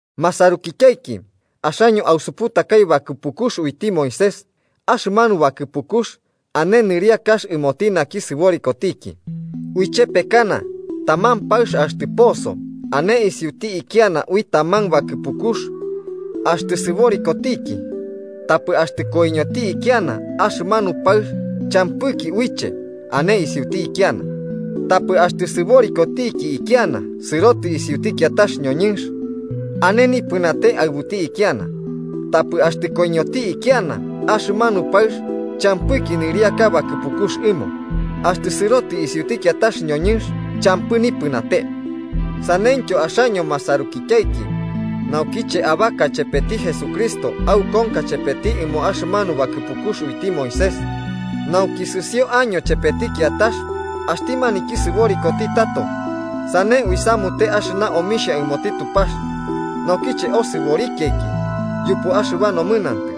Masarukityaiki, axaño ausuputakai bakɨpukux uiti Moisés, axɨmanu bakɨpukux ane nɨriakax ɨmoti naki sɨborikotiki. Uichepekana, taman paɨx axtɨ poso ane isiuti ikiana ui taman bakɨpukux axtɨ sɨborikotiki. Tapɨ axtɨ koiñoti ikiana, axɨmanu paɨx champɨki uiche ane isiuti ikiana. Tapɨ axtɨ sɨborikotiki ikiana sɨrotɨ isiuti kiatax ñoñɨnx, ane nipɨnate aɨbuti ikiana, tapɨ axtɨ koiñoti ikiana, axɨmanu paɨx champɨki nɨriaka bakɨpukux ɨmo axtɨ sɨrotɨ isiuti kiatax ñoñɨnx, champɨ nipɨnate. Saneityo axaño, masarukityaiki, naukiche abaka chepeti Jesucristo aukonka chepeti ɨmo axɨmanu bakɨpukux uiti Moisés, nauki sɨsio año chepeti kiatax, axti maniki sɨborikoti tato. Sane uisamute axɨba omixhia ɨmoti Tupax. Naukiche osɨborikiaiki yupu axɨba nomɨnantɨ,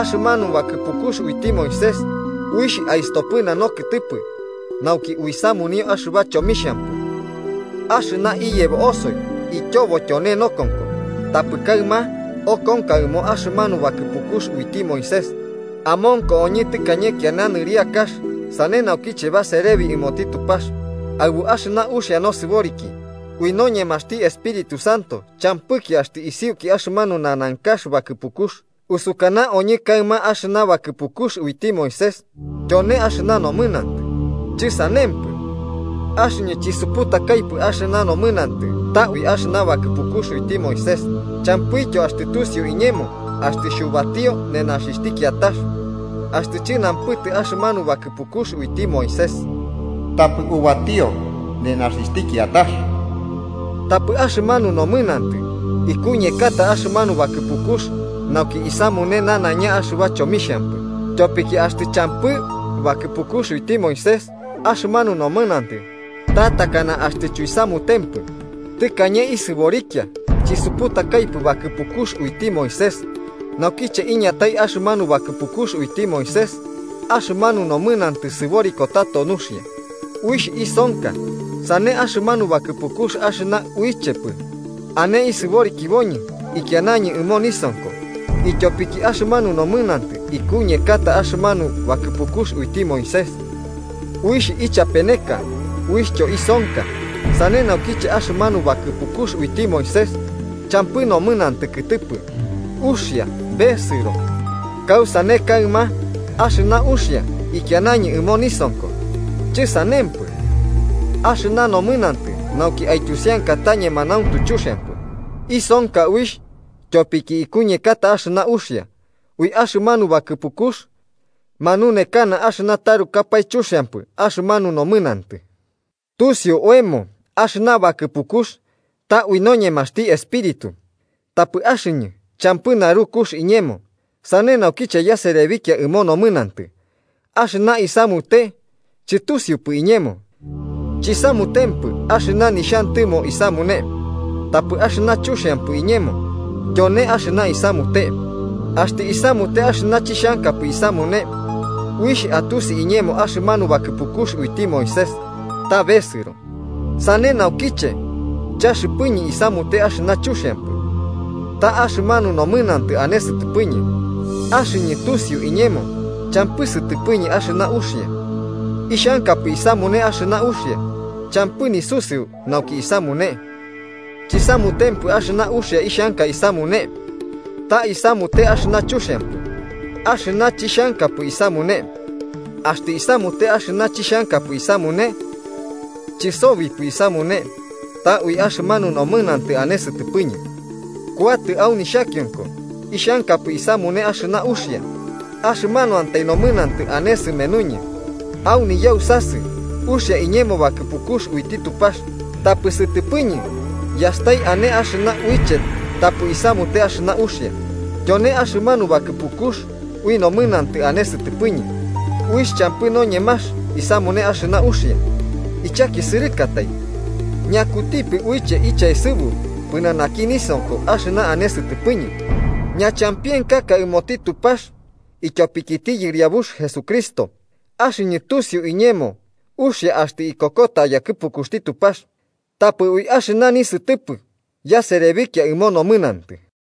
axɨmanu bakɨpukux uiti Moisés uixh aistopɨna nokɨtɨpɨ nauki uisamunio axɨba chomixhampɨ, axɨna iyebo osoi ityobo tyone nokonko. Tapɨ kaɨma okonka ɨmo axɨmanu bakɨpukux uiti Moisés amonko oñɨ tɨkañe kiana nɨriakax, sane nauki baserebi ɨmoti Tupax aɨbu axɨna uxia nosɨboriki ui noñemaxti Espíritu Santo champɨki axtɨ isiuki axɨmanu nanankax bakɨpukux. ¿Usukana oñɨ kaɨma axɨna bakɨpukux uiti Moisés tyone axɨna nomɨnantɨ? ¡Chɨsanempɨ! Axɨñɨ chisuputakaipɨ axɨmanu nomɨnantɨ ta ui axɨna bakɨpukux uiti Moisés. Champɨityo axtɨ tusiu iñemo axtɨ xhubatio nenaxixhti kiatax, axtɨ chɨnampɨtɨ axɨmanu bakɨpukux uiti Moisés: “Tapɨ ubatio nenaxixhti kiatax.” Tapɨ axɨmanu nomɨnantɨ ikuñekata axɨmanu bakɨpukux nauki isamune nanaiña axɨba chomixhampɨ. Tyopiki axtɨ champɨ bakɨpukux uiti Moisés, axɨmanu nomɨnantɨ ta takana axtɨ chuisamutempɨ. Tɨkañe isɨborikia chisuputakaipɨ bakɨpukux uiti Moisés. Naukiche iñatai axɨmanu bakɨpukux uiti Moisés. Axɨmanu nomɨnantɨ sɨboriko tato nuxia, uixh isonka. Sane axɨmanu bakɨpukux axɨna uichepɨ ane isiborikiboñɨ, ikianañɨ ɨmo nisonko, ityopiki axɨmanu nomɨnantɨ ikuñekata axɨmanu bakɨpukux uiti Moisés uixh ichapeneka, uixhtyo isonka. Sane naukiche axɨmanu bakɨpukux uiti Moisés, champɨ nomɨnantɨ kɨtɨpɨ, uxia besɨro. Kausane kaɨma, ¿axɨna uxia ikianañɨ ɨmo nisonko? ¡Chɨsanempɨ! Axɨna nomɨnantɨ nauki aityusianka ta ñemanauntu chuxiampɨ, isonka uixh tyopiki ikuñekata axɨna uxia. Ui axɨmanu bakɨpukux manunekana axɨna tarukapae chuxiampɨ axɨmanu nomɨnantɨ. Tusiu oemo axɨna bakɨpukux ta ui noñemaxti Espíritu, tapɨ axɨñɨ champɨ narukux iñemo, sane naukiche yaserebikia ɨmo nomɨnantɨ. Axɨna isamute chɨtusiupɨ iñemo, chisamutempɨ axɨna nixhantɨmo isamune, tapɨ axɨna chuxiampɨ iñemo, tyone axɨna isamute. Axtɨ isamute axɨna chixhankapɨ isamune, uixh atusi iñemo axɨmanu bakɨpukux uiti Moisés ta besɨro. Sane naukiche, chaxɨpɨñɨ isamute axɨna chuxiampɨ, ta axɨmanu nomɨnantɨ ane sɨtɨpɨñɨ. Axɨñɨ tusiu iñemo champɨ sɨtɨpɨñɨ axɨna uxia. Ixhankapɨ isamune axɨna uxia, champɨ nisusɨu nauki isamune. Chisamutempɨ axɨna uxia ixhanka isamune, ta isamute axɨna chuxiampɨ, axɨna chixhankapɨ isamune. Axtɨ isamute axɨna chixhankapɨ isamune, chɨsobipɨ isamune, ta ui axɨmanu nomɨnantɨ ane sɨtɨpɨñɨ. Kuatɨ au nixhakionko, ixhankapɨ isamune axɨna uxia, axɨmanuantai nomɨnantɨ ane sɨmenuñɨ. Au niyausasɨ uxia iñemo bakɨpukux uiti Tupax, tapɨ sɨtɨpɨñɨ yastai ane axɨna uiche tapɨ isamute axɨna uxia: tyone axɨmanu bakɨpukux ui nomɨnantɨ ane sɨtɨpɨñɨ, uixh champɨ noñemax isamune axɨna uxia. ¡Ichakisɨrɨkatai! ¿Ñakutipɨ uiche ichaesɨbu pɨnanaki nisonko axɨna ane sɨtɨpɨñɨ? Ñachampienkaka ɨmoti Tupax ityopikiti Yɨriabux Jesucristo. Axɨñɨ tusiu iñemo uxia axtɨ ikokota yakɨpukuxti Tupax, tapɨ ui axɨna nisɨtɨpɨ yaserebikia ɨmo nomɨnantɨ.